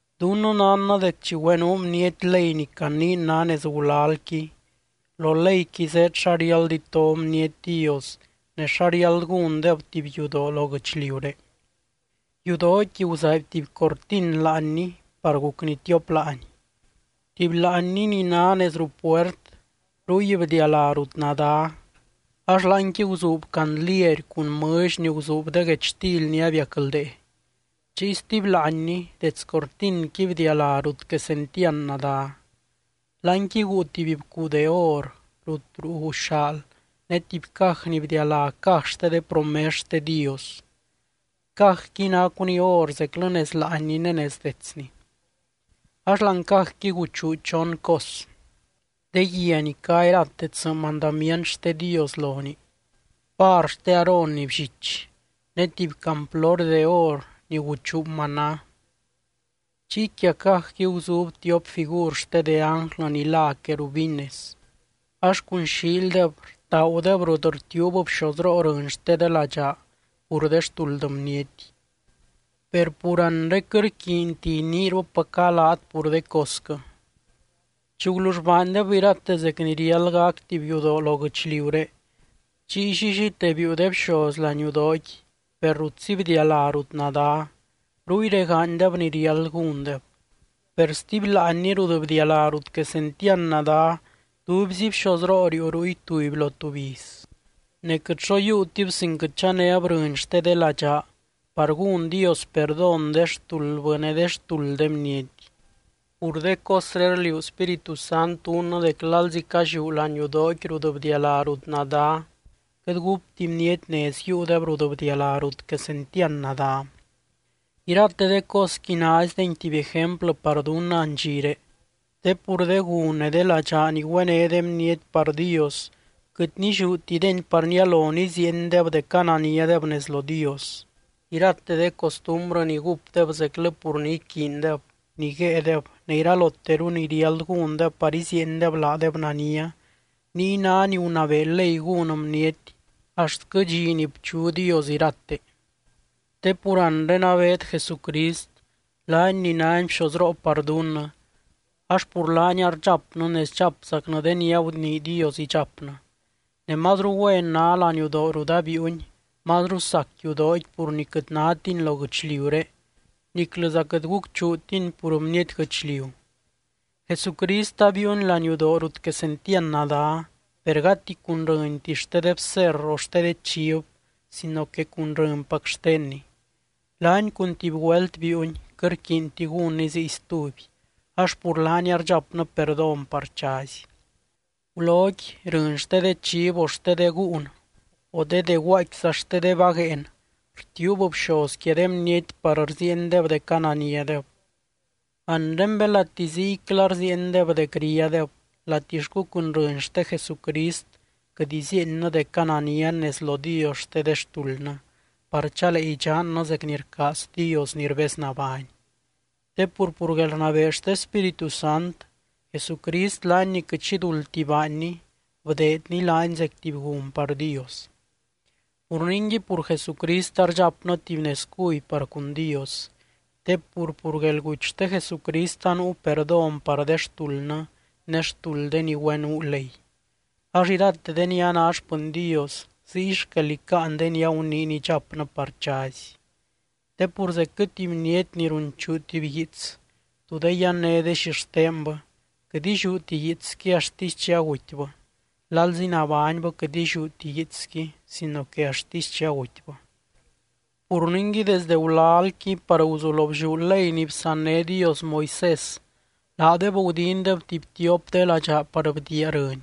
Dunnɨ nánnɨ dec chi güenuu bniety ley ni caniin ná nez gulalqui, lo leyqui zéed xa riáld ito bniety Dios, ne xa riáld gúndeb tuby yudoo lo guɨchliuré. Yudooqui guzaaby tuby cortin láanni par gucni tiop láani. Tuby láanni ni ná nez ruu puert, ruy bdialá rut Nadá ax láanqui guzuub candliery cun mɨlly ni guzuub de guechtily ni abiacldee. Chiy stuby láanni, dets cortinqui bdialá rut Quesentiand Nadá. Láanqui guu tuby bcuu de or rut ruu guxaal ne tuby caj ni bdialá caj xte de promes xte Dios. Cajqui nacuni or zeclɨ nez láanni ne nez detsni. Ax láani cajqui guchuu chon cos: De guia ni cá irate tsɨ mandamient xte Dios lonii, var xte Aarón ni bllich, ne tuby camplory de or ni guchuu maná. Chiy quia cajqui guzuub tiop figur xte de ánglɨ ni lá querubines ax cun xiildeb rtaagudeb rut rtiuub bxozroo rɨny xte de ladxaa pur de xtuld bniety. Per pur anre quɨt rquiinti iniirupaca laat pur de cosquɨ. Chi gulull baandeb irate zec ni riáld gac tuby yudoo lo guɨchliuré, chiy llillite biiu de bxoz laniudooqui per rutzi bdialá rut Nadá, ruy regaanydeb ni riáld gúndeb. Per stuby láanni rut bdialá rut Quesentiand Nadá, tubyzi bxozroo riiu ruy tuby lo tuby iz. Ne quɨt xo yiiutib sin quɨt chanéb rɨny xte de ladxaa par gún Dios perdón de xtuldbɨ ne de xtuld de bniety. Pur de cosré rliuu Spíritu Sant dunnɨ dec lalzi calliú laniudooqui rut bdialá rut Nadá, quɨt gúpti bniety nez yiiudeb rut bdialá rut Quesentiand Nadá. Irate de cosqui naizdeni tuby ejemplɨ par dunnɨ andxiré, te pur de gun ne de ladxaa ni güené de bniety par Dios, quɨt nilliútideni par nialo niziiendeb dec ananiadeb nez lo Dios. Irate de costumbrɨ ni gúpdeb zeclɨ pur ni iquiindeb, ni guéedeb ne iraloteru ni riáld gúndeb par iziiendeb laadeb nania, niy ná ni gunabee ley gún bniety axtquɨ dxi ni bchu Dios irate. Te pur anre abeed Jesucrist, laany ni nány bxozroo par dunnɨ, ax pur laany ardxapnɨ ne sdxapzacnɨ de ni agunii Dios idxapnɨ. Ne mazru güen ná laniudoo rut abiiuny, mazru sac yudooqui pur ni quɨt nátini lo guɨchliuré niclɨza quɨt gucchuutini pur bniety guɨchliu. Jesucrist abiiuny laniudoo rut Quesentiand Nadá, per gati cun rɨnti xte de bserr o xte de chiv sino que cun rɨnpac xtenny. Laany cun tuby güelt biiuny, quɨt rquiinti gúnny ziy stuby ax pur laany ardxapnɨ perdón par chazy. Guloqui, rɨny xte de chiv o xte de gúun o de dé guaaicquiza xte de vagueen rtiuub bxoz quia de bniety par rziiendeb dec ananiadeb. Anre belati ziycla rziiendeb dec ríadeb, latixcu cun rɨny xte Jesucrist quɨt iziiennɨ dec ananian nez lo Dios xte de xtuldnɨ, par chalee idxannɨ zec ni rcaaz Dios ni rbeznabány. Te pur, pur guelrnabee xte Spíritu Sant, Jesucrist laany ni quɨt xi duldti baanny, bdeedny laany zec tuby gun par Dios. Pur ningui, pur Jesucrist ardxapnɨ tuby nez cuby par cun Dios. Te pur, pur guelguty xte Jesucrist anuu perdón par de xtuldnɨ ne xtuld de ni güenuu ley, ax irate de ni a ná xpɨny Dios ziy xquel icáan de ni aguniiny idxapnɨ par chazy. Te pur zecquɨ tuby bniety ni runchuu tuby guiits tú de yanné de xixtenbɨ, quɨt illiúti guiitsqui axtisy chi agutybɨ. Lalzi nabánybɨ quɨt illiúti guiitsqui sino que axtisy chi agutybɨ. Pur ningui, desdɨ gulalqui par guzulo blliú ley ni bsanné Dios Moisés, laadeb gudindeb tuby tiop de ladxaa par bdiia rɨny.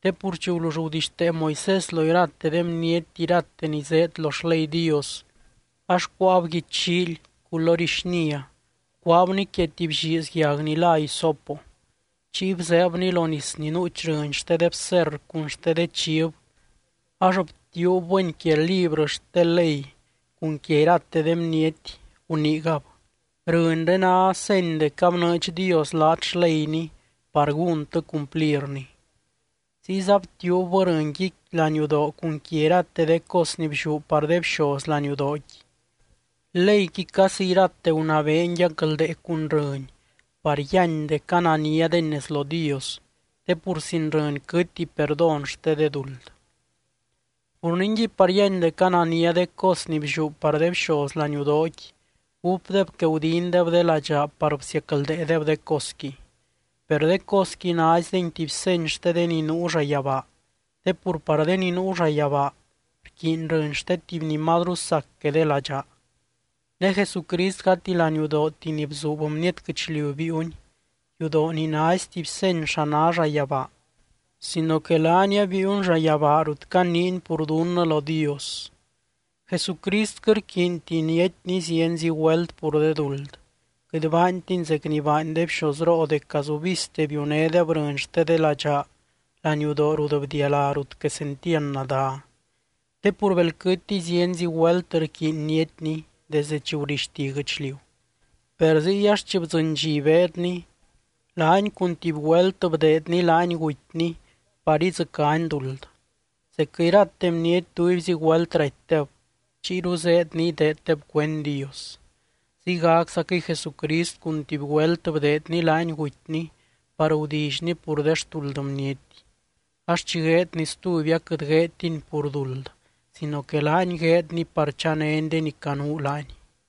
Te pur chi gulull gudixtee Moisés lo irate de bniety irate ni zéed lo xley Dios, ax cuáab guichllíily culory xnia bcuaabni quia tuby lliiz yag ni lá hisopo. Chiy bzeebni lo nis ni nuuch rɨny xte de bserr cun xte de chiv ax btiuubbɨni quia librɨ xte ley cun quia irate de bniety guniigab: “Rɨnré ná seny dec abnɨɨdx Dios laat xleyny par gúntɨ cumplirni.” Ziyza btiuubbɨ rɨnqui laniudoo cun quia irate de cos ni blliú par de bxoz laniudooqui. Leyqui casi irate gunabeeni yacldee cun rɨny par yíany dec ananiadeni nez lo Dios, te pur sin rɨny quɨtti perdón xte de duld. Pur ningui, par yíany dec anania de cos ni blliú par de bxoz laniudooqui, gúpdeb que gudindeb de ladxaa par bsiacldeedeb de cosqui. Per de cosqui naizdeni tuby seny xte de ni nuu llayabaa, te pur par de ni nuu llayabaa rquiiny rɨny xte tuby ni mazru sac que de ladxaa. Ne Jesucrist gati laniudooti ni bzuub bniety guɨchliu biiuny, yudoo ni naizy tuby seny xa ná llayabaa sino que laany abiiuny llayabaa rut caniiny pur dunnɨ lo Dios. Jesucrist quɨt rquiinti niatyny zienzi güelt pur de duld, quɨt baantiny zec ni baany de bxozroo dec gazubizte biunédeb rɨny xte de ladxaa laniudoo rut bdialá rut Quesentiand Nadá. Te pur belquɨtiy, zienzi güelt rquiiny niatyny desdɨ chi gurixti guɨchliu. Per ziy ax chi bdzɨny dxi beedny, laany cun tuby güelt bdeedny laany gutyny par idzɨcány duld. Zecquɨ irate bniety tubyzi güelt ratydeb, chiyru zéed ni ideeddeb cuend Dios. Ziygaczaquɨy Jesucrist cun tuby güelt bdeedny laany gutyny par gudillyny pur de xtuld bniety. Ax chi gueedny stuby aquɨt gueedtiny pur duld, sino que laany gueedny par chanény de ni canuu laany.